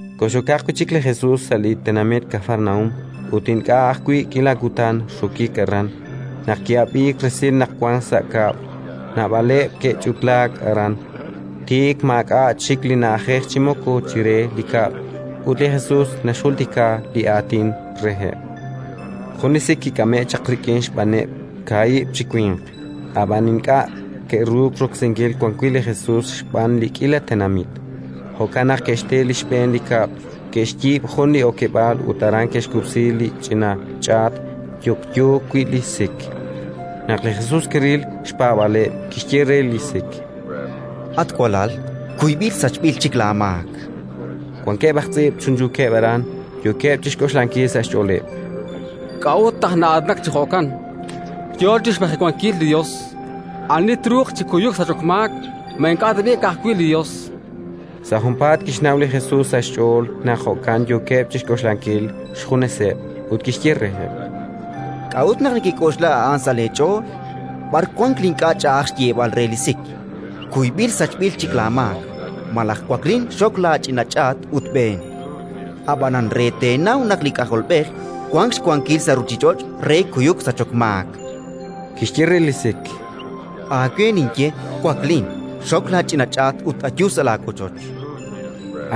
Kox'okaq wi' chik li Jesus sa' li tenamit Kafarnaúm; ut ink'a' ajwi' k'iila kutan rokik aran, naq ki'ab'iik resil naq wank sa' kab'l. Naab'aleb' ke'ch'utlaak aran; tik maak'a' chik li na'ajej chi moko chire li kab'l: ut li Jesus naxjultika li Aatin reheb'. Jun li sik kik'ame'k chaq rik'in xb'aaneb' kaahib' chi winq, ab'an ink'a' ke'ruuk roksinkil wan wi' li Jesus xb'aan li k'iila tenamit; jo'kan naq ke'xte li xb'een li kab'l, ke'xyiib' jun li okeb'aal ut aran ke'xkub'si li ch'ina ch'aat yokyo wi' li sik. Naq li Jesus kiril li xpaab'aaleb', kixye re li sik: —At walal, kuyb'il sachb'il chik laamaak. Wankeb' aj tz'iib' chunchuukeb' aran, yookeb' chi xk'oxlankil sa' xch'ooleb': “K'a'ut naq na'aatinak chi jo'kan? Yo chi xmajewankil li Yos. Ani truuq chi kuyuk sachok maak? Ma ink'a' tab'i' ka'ajwi' li Yos?”. Sa' junpaat kixnaw li Jesus sa' xch'ool naq jo'kan yookeb' chi xk'oxlankil xjuneseb', ut kixye reheb': —K'a'ut naq nekek'oxla a'an sa' leech'ool? B'ar wank li ink'a' ch'a'aj xyeeb'al re li sik: «Kuyb'il sachb'il chik laamaak», malaj: «Waklin, xok laach'ina ch'aat ut b'een»? Ab'anan re teenaw naq li K'ajolb'ej wank xwankil sa' ruuchich'och' re kuyuk sachok maak -kixye re li sik: Aawe ninye, waklin, xok laach'ina ch'aat ut ayu sa' laawochoch.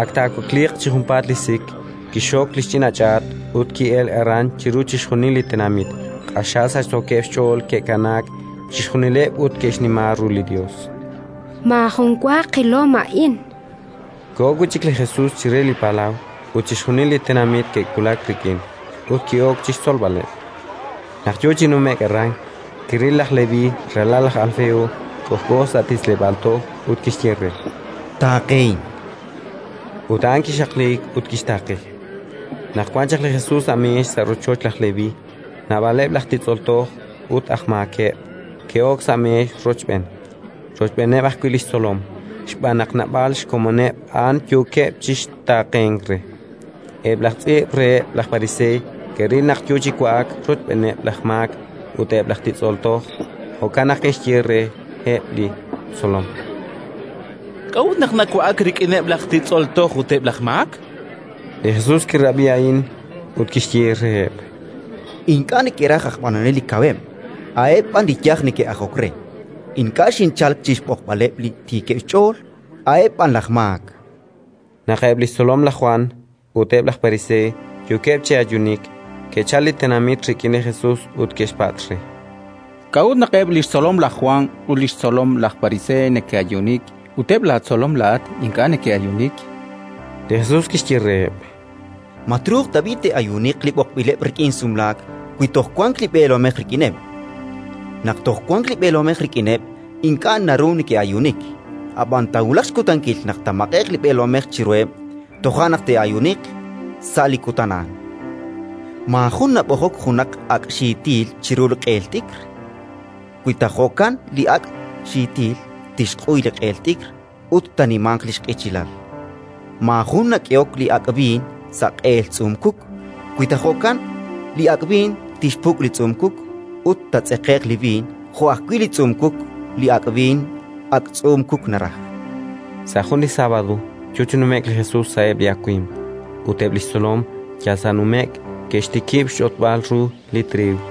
Ak taawakliiq chi junpaat li sik, kixxok li xch'ina ch'aat ut ki'elk aran chiru chixjunil li tenamit: q'axal sachsookeb' xch'ool ke'kanaak chixjunileb' ut ke'xnima ru li Yos: “Maajun wa qilom a'in”, chankeb'. Koho wi' chik li Jesus chire li palaw, ut chixjunil li tenamit ke'wulak rik'in; ut ki'ok chi xtzolb'aleb'. Naq yo chi nume'k aran, kiril laj Leví, ralal laj Alfeo, k'ojk'o sa' titz'leb'aal toj, ut kixye re: —Taaqehin. Ut laj Leví kixaqliik ut kixtaaqe. Naq wan chaq li Jesus sa' meex sa' rochoch laj Leví, naab'aleb' laj titz'ol toj ut aj maakeb' ke'ok sa' meex rochb'een, rochb'eeneb' ajwi' li xtzolom, xb'aan naq naab'al xkomoneb' a'an yookeb' chi taaqenk re. Eb' laj tz'iib' reheb' laj pariseey ke'ril naq yo chi wa'ak rochb'eeneb' laj maak ut eb' laj titz'ol toj; jo'kan naq ke'xye reheb' li xtzolom: —K'a'ut naq nawa'ak rik'ineb' laj titz'ol toj ut eb' laj maak? Li Jesus kirab'i a'an ut kixye reheb': —Ink'a' neke'raj aj b'anonel li kaweb', a'eb' b'an li yaj neke'ajok re. Ink'a' xinchalk chi xb'oqb'aleb' li tiikeb' xch'ool, a'eb' b'an laj maak. Naq eb' li xtzolom laj Jwan ut eb' laj pariseey yookeb' chi ayuunik, ke'chalk li tenamit rik'in li Jesus ut ke'xpatz' re: —K'a'ut naq eb' li xtzolom laj Jwan ut li xtzolomeb' laj Pariseey neke'ayuunik, ut eb' laatzolom laa'at ink'a' neke'ayuunik? Li Jesus kixye reheb': —Ma truuq tab'i' te'ayuuniq li b'oqb'ileb' rik'in sumlaak wi toj wank li b'eelomej rik'ineb'? Naq toj wank li b'eelomej rik'ineb', ink'a' naru neke'ayuunik. Ab'an taawulaq xkutankil naq taamaq'e'q li b'eelomej chiruheb': toja' naq te'ayuuniq, sa' li kutan a'an. “Maajun nab'ojok junaq ak' xiitil chiru li q'eel t'ikr. Wi ta jo'kan, li ak' xiitil tixq'uy li q'eel t'ikr ut taanimanq li xq'ichilal. Maajun nak'ehok li ak' b'iin sa' q'eel tz'uum-kuk. Wi ta jo'kan, li ak' b'iin tixpuk' li tz'uum-kuk ut taatz'eqe'q li b'iin jo' ajwi' li tz'uum-kuk. Li ak' b'iin, ak' tz'uum-kuk naraj”. Sa' jun li sábado yo chi nume'k li Jesus sa'eb' li awimq, ut eb' li xtzolom yal sa' nume'k ke'xtikib' xch'otb'al ru li triiw.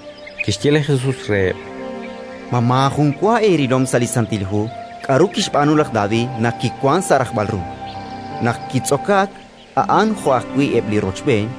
Kixye li Jesus reheb': —Ma maajun wa eerilom sa' li Santil Hu k'aru kixb'aanu laj David naq kiwank sa' rajb'al ru, naq kitz'okaak a'an jo'wi' eb' li rochb'een?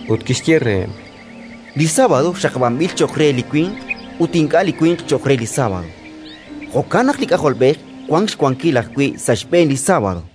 Ut kixye reheb': —Li sábado xaqab'anb'il cho'q re li winq ut ink'a' li winq cho'q re li sábado. Jo'kan naq li K'ajolb'ej wank xwankil ajwi' sa' xb'een li sábado.